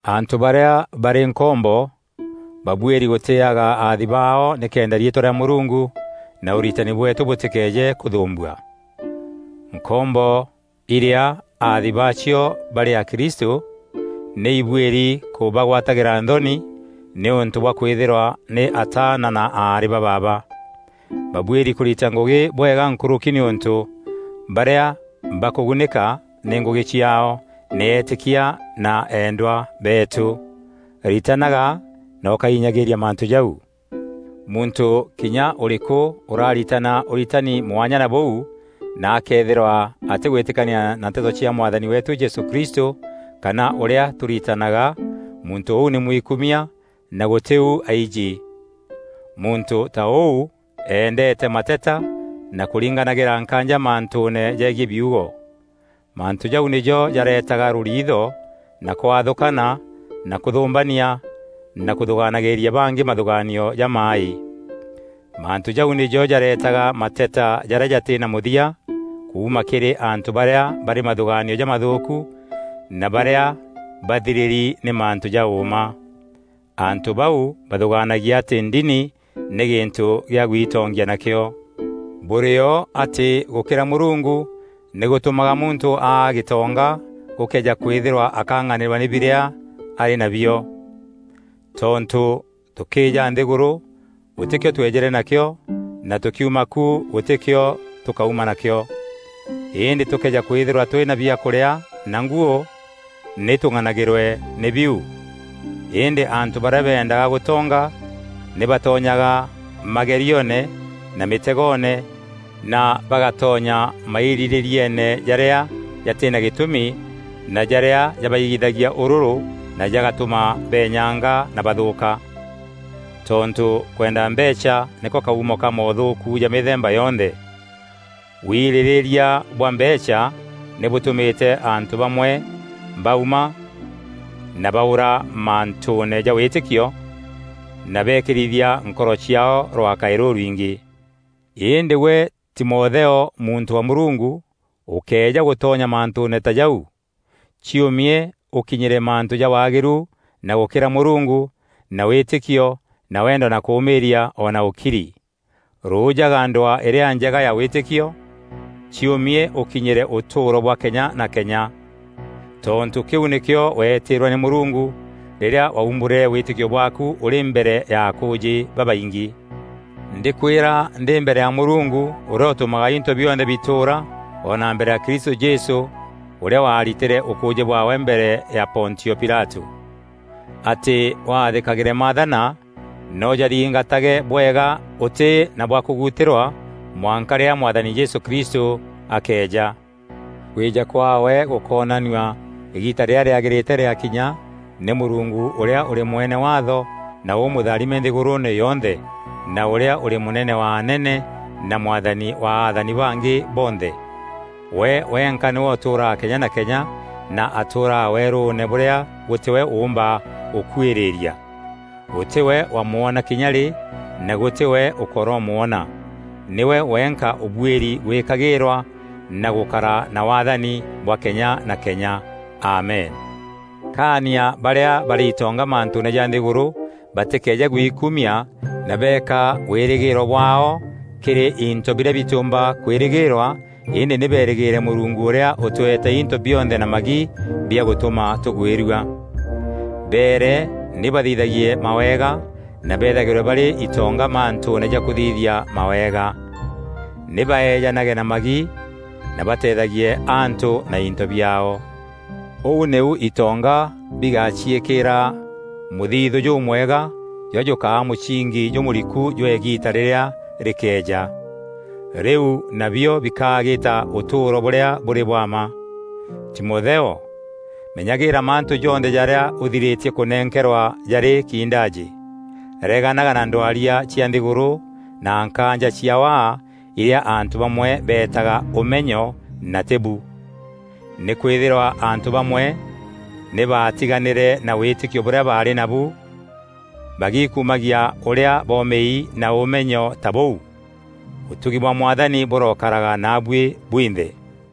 Antû barîa barî nkombo babuîri gûtîîaga aathi baao nîkenda riîtwa rîa Mûrungu na ûritani bweetû bûtîkeeje kûthûûmbua. Nkombo irîa aathi baacio barî akristû nî ibuîri kûbagwatîra nthoni nîûntû bwa kwîthîrwa nî ataana na aarî ba baaba. Babuîri kûrita ngûgî bwega nkûrûki nîûntû barîa bakûgunîka nî ngûgî ciaao nî eetîkia na eendwa beetû. Ritanaga na ûkainyagîîria mantû jau. Muntû kinya ûrîkû ûraritana ûritani mwanya na bûu na akëethîrwa atîgwîtîkania na nteto cia Mwathani weetû Jesû Kristû kana ûrîa tûritanaga, muntû ûu nî mwikumia na gûtî u aijî. Muntû ta ûu eendeete mateta na kûringanagîra nkaanja mantûûne jegiî biugo. Mantû jau nîjo jareetaga rûriitho na kwathûkana na kûthûmbania na kûthûgaanagîria bangî mathûgaanio jamaaî. Mantû jau nîjo jareetaga mateta jarîa jatî na mûthia kuuma kîrî antû barîa barî mathûgaanio jamathûûku na barîa bathirîri nî mantû ja ûûma. Antû bau bathûgaanagia atî ndini nî gîntû kîa gwitongia nakîo. Bûrîo atî gûkîra Mûrungu nî gûtûmaga muntû aa gîtonga gûkëeja kwîthîrwa akang'anîrwa nî birîa arî nabio. Tontû tûkîîja nthîgûrû, gûtî kîo tweejîre nakîo na tûkiuma ku, gûtî kîo tûkauma na kîo. Îndî tûkëeja kwîthîrwa tûrî na biakûrîa na nguû, nî tûng'anagîrwe nî biu. Îndî antû barîa bendaga gûtonga nî batonyaga magerioone na mîtegoone na bagatonya mairîrîrieene jarîa jatî na gîtûmi na jarîa jabaigithagia ûrûrû na jagatûma beenyanga na bathûûka. Tontû kwenda mbeecha nîko kaumo ka moothûûku ja mîthemba yonthe. Wirîrîria bwa mbeecha nî bûtûmîte antû bamwe bauma na baûra mantûûne ja wîtîkio na beekîrithia nkoro ciaao rwaakaî rûrwingî. Îndî gwe Timotheo, muntû wa Mûrungu, ûkëeja gûtonya mantûûne ta jau. Ciûmie ûkinyîre mantû ja waagîru na gûkîra Mûrungu na wîtîkio na wendo na kûmîîria o na ûkiri. Rûjaga ndwaa îrîa njega ya wîtîkio; ciûmie ûkinyîre ûtûûro bwa kenya na kenya. Tontû kîu nîkîo weetîîrwe nî Mûrungu rîrîa waumbûrîre wîtîkio bwaaku ûrî mbere ya akûûjî babaingî. Ndîkwîra ndî mbere ya Mûrungu ûrîa ûtûmaga into bionthe bitûûra o na mbere ya Kristû Jesû ûrîa waritîre ûkûûjî bwaawe mbere ya Pontio Pilatû, atî wathîkagîre maathana na ûjathingatage bwega ûtî na bwa kûgutîrwa mwanka rîrîa Mwathani Jesû Kristû akeeja. Kwîja kwaawe gûkoonanua îgiita rîrîa rîagîrîte rîgakinya nî Mûrungu ûrîa ûrî Mwene waatho na ûmûtharime nthîgûrûûne yonthe, na ûrîa ûrî Mûnene wa anene na Mwathani wa athani bangî bonthe. We wenka nîwe ûtûûraga kenya na kenya na atûûraga weerûûne bûrîa gûtî we ûûmba gûkuîrîîria. Gûtî we wamwona kinya rî na gûtî we ûkoromwona. Nîwe wenka ûbuîri gwîkagîîrwa na gûkara na waathani bwa kenya na kenya! Amen. Kaania barîa barî itonga mantûûne ja nthîgûrû batîkeeje gwikumia na beeka wîrîgîîro bwaao kîrî into birîa bitîûmba kwîrîgîîrwa îndî nî berîgîîre Mûrungu ûrîa ûtweete into bionthe na magi bia gûtûma tûgwîrua. Beere nî bathithagie mawega na bethagîrwe barî itonga mantûûne ja kûthithia mawega. Nî baeejanage na magi na bateethagie antû na into biaao. Ûu nîu itonga bigaciîkîra mûthithû jûmwega jûrîa jûkaa mûsingi jûmûriku jwa îgiita rîrîa rîkeeja. Rîu nabio bikagîta ûtûûro bûrîa bûrî bwa mma. Timotheo, menyagîîra mantû jonthe jarîa ûthirîtie kûnenkerwa jarî kiindajî. Reganaga na ndwaria cia nthîgûrû na nkaanja cia waa irîa antû bamwe beetaga “Ûmenyo” na tî bu. Nîkwîthîrwa antû bamwe nî baatiganîre na wîtîkio bûrîa baarî nabu bagiikumagia ûrîa bomîi na ûmenyo ta bûu. Ûtugi bwa Mwathani bûrokaraga naabuî bwinthe.